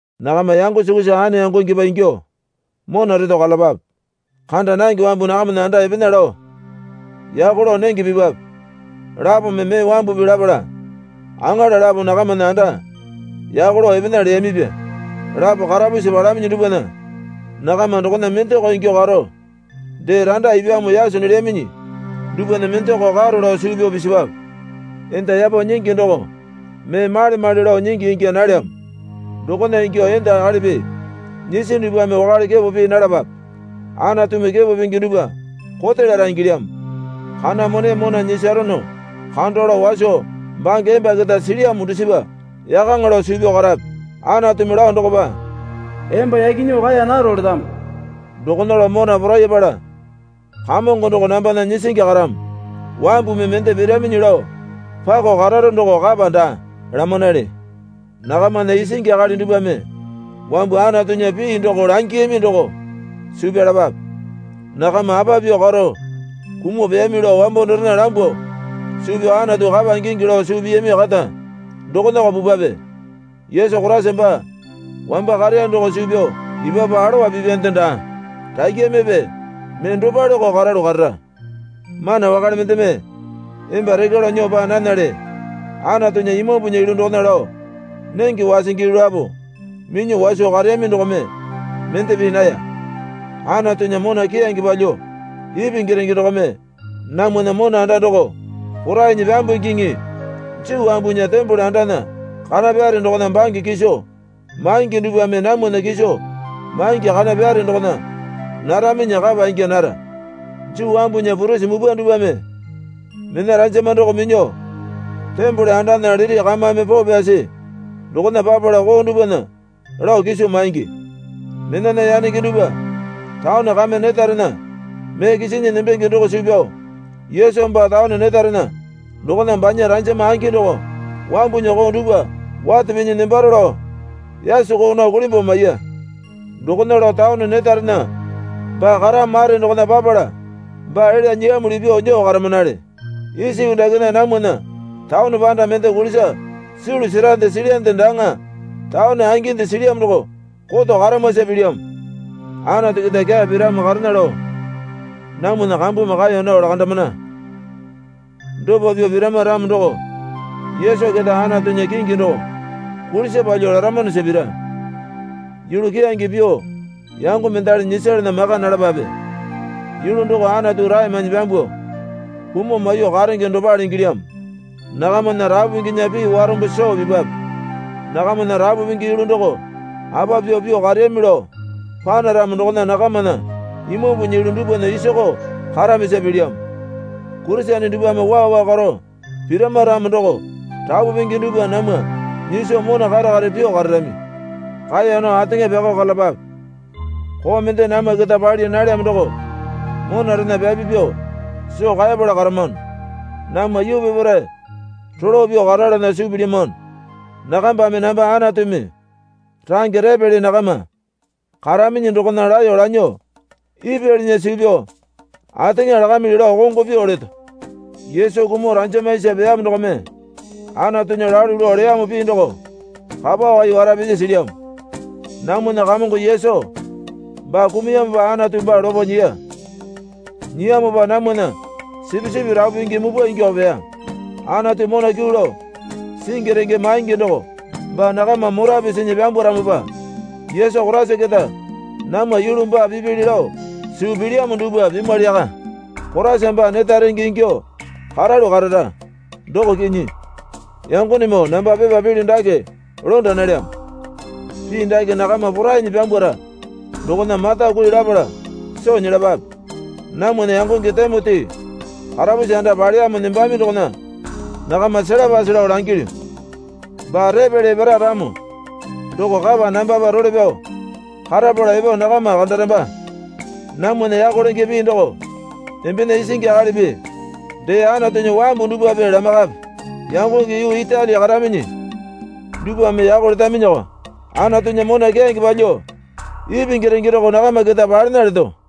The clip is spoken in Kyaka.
Nakama yango sukusa ane yangongepa ingyuo mona reto karalapape. Kanda nange wambu nakamana anda epena lao yako lao nenge pipwape. Lapome mee wambupi lapala aŋala lapo nakamana anda yako lao epena leyamipya. Lapo karapusi palaminyi dupwana nakama dokona mendako ingyuo karo, dee randa ipyamo yaso nelyaminyi dupwana mendako karo lao suu pyao pisipwape. Enda yapo nyingi doko mee male male lao nyingi ingya nalyamo dokona ingyuo enda akalipi nyisi dupwame wakale kepo pii nalapape. Anatumi kepo pingi dupwa kote lara ingilyamo. Kana mone mona nyisarono kando lao waso bange emba keta silyamo dusipa yakaŋa lao suu pyao karape. Anatumi lao dokopa, Emba yaki nyuo kaeya naro letamo. Dokona lao mona porayapala, Kamongo doko nambana nyisingi karamo. Wambumi mende piraminyi lao pako kararo doko kapa daa, lamanale. Nakamana isingi akali dupwame wambu Anatunya pii doko langiyami doko suu pyalapape. Nakama apa pyuo karo kumuo peyami lao wambo dorena lambuo suu pyao Anatu kapa ingingi lao suu piyami kata dokonako pupwape. Yesu Koraisa baa wamba kareya doko suu pyao epapu alowa pipyande daa. Rakyamepe mee dopaleko karalu karara. Mana wakale mendeme emba rekya lao nyuo paa nanale. Anatunya Imambunya yulu dokona lao nenge wasingi yulu lapo minyuo waso kareyami dokome mende pii naya. Anatunya mona keyange palyuo ipingi renge dokome namwana mona anda doko porainyi pyambungiŋi. Juu wambunya tembole andana kana pyare dokona bange kiso maingi dupwame namwana kiso maingi kana pyare dokona naraminyi kapa ingya nara. Juu wambunya purisi mupwa dupwame mena ranjama doko minyuo tembole andana liti kamame poo pyasi dokona papala koo dupwana lao kiso maingi. Menana yanenge dupwa taone kame netarena mee kisinyi nembenge doko suu pyao Yesu baa taone netarena dokona banya ranjama angi doko wambunya koo dupwa wate pinyi nembaro lao yaso koo nao kulimbuo maiya. Dokona lao taone netarena baa karamo mare dokona papala baa elya nyiyamuli pyuo nyuo karamanale. Isa yuu dakena namwana taone panda mende kulisa sulu serande silyande daaŋa. Taone anginde silyamo doko koto karamwasa pilyamo. Anatu keta kyaa piramo karena lao namwana kambumi kaeya nao lakandamana. Dopa pyuo pirama ramo doko Yesu keta Anatunya kingi doko kulisa palyuo laramanosa pira. Yulu keyange pyuo yango mendali nyisalana maka nalapape. Yulu doko Anatu rae mainyi pyambuo kumuo maiyuo karenge dopale ingilyamo. Nakamana rapu pinginya pii warombo soo pipwape. Nakamana rapu pingi yulu doko apa pyuo pyuo kareyami lao panaramo dokona nakamana Imambunya yulu dupwana isakao karamisa pilyamo. Kurisene dupwame waa waa karo pirama ramo doko rapu pingi dupwa namwa nyiso mona kare kare pyuo kararami. Kaeya nao ateŋa pyakao karalapape. Koo mende namwa keta pali nalyamo doko monarena pyapi pyuo soo kaeyapala karamano. Namwa yuu peparae rolo pyuo karalana suu pilyamano. Nakambame namba Anatumi range repele nakama karaminyi dokona laeyo lanyuo ipyalinya suu pyao ateŋa lakamili lao kongo pyuo leto. Yesu kumuo ranjama isa peyamo dokome Anatunya lalu lao leyamo pii doko kapa wai wara pisi silyamo. Namwana Kamongo Yesu baa kumuyamopa Anatu baa lopo nyiya. Nyiyamopa namwana sipisipi rapu pingi mupwa ingyuo peya. Anatu mona kyuu lao singi renge maingi doko baa nakama mora pisinyi pyambwaramopa Yesu Koraisa keta namwa yulu baa pipili lao suu pilyamo dupwa pimwali yaka. Koraisa baa neta renge ingyuo karalu karara, doko kinyi. Yangonemoo namba pepa pilyu dake londa nalyamo. Pii dake nakama porainyi pyambwara dokona mata kui lapala soo nyelapape. Namwana yangonge Timoti karapusi anda paleyamo nembami dokona nakama selapase lao langilyu. Baa repele epara ramo doko kapa nambapa role pyao karapala epo nakama kandaramba. Namwana yako lenge pii doko embena isingi akalipi dee Anatunya wambu dupwape lamaiyakape. Yangonge yuu Itali karaminyi dupwame yako letaminyako. Anatunya mona keyange palyuo ipingi renge doko nakama keta palena leto.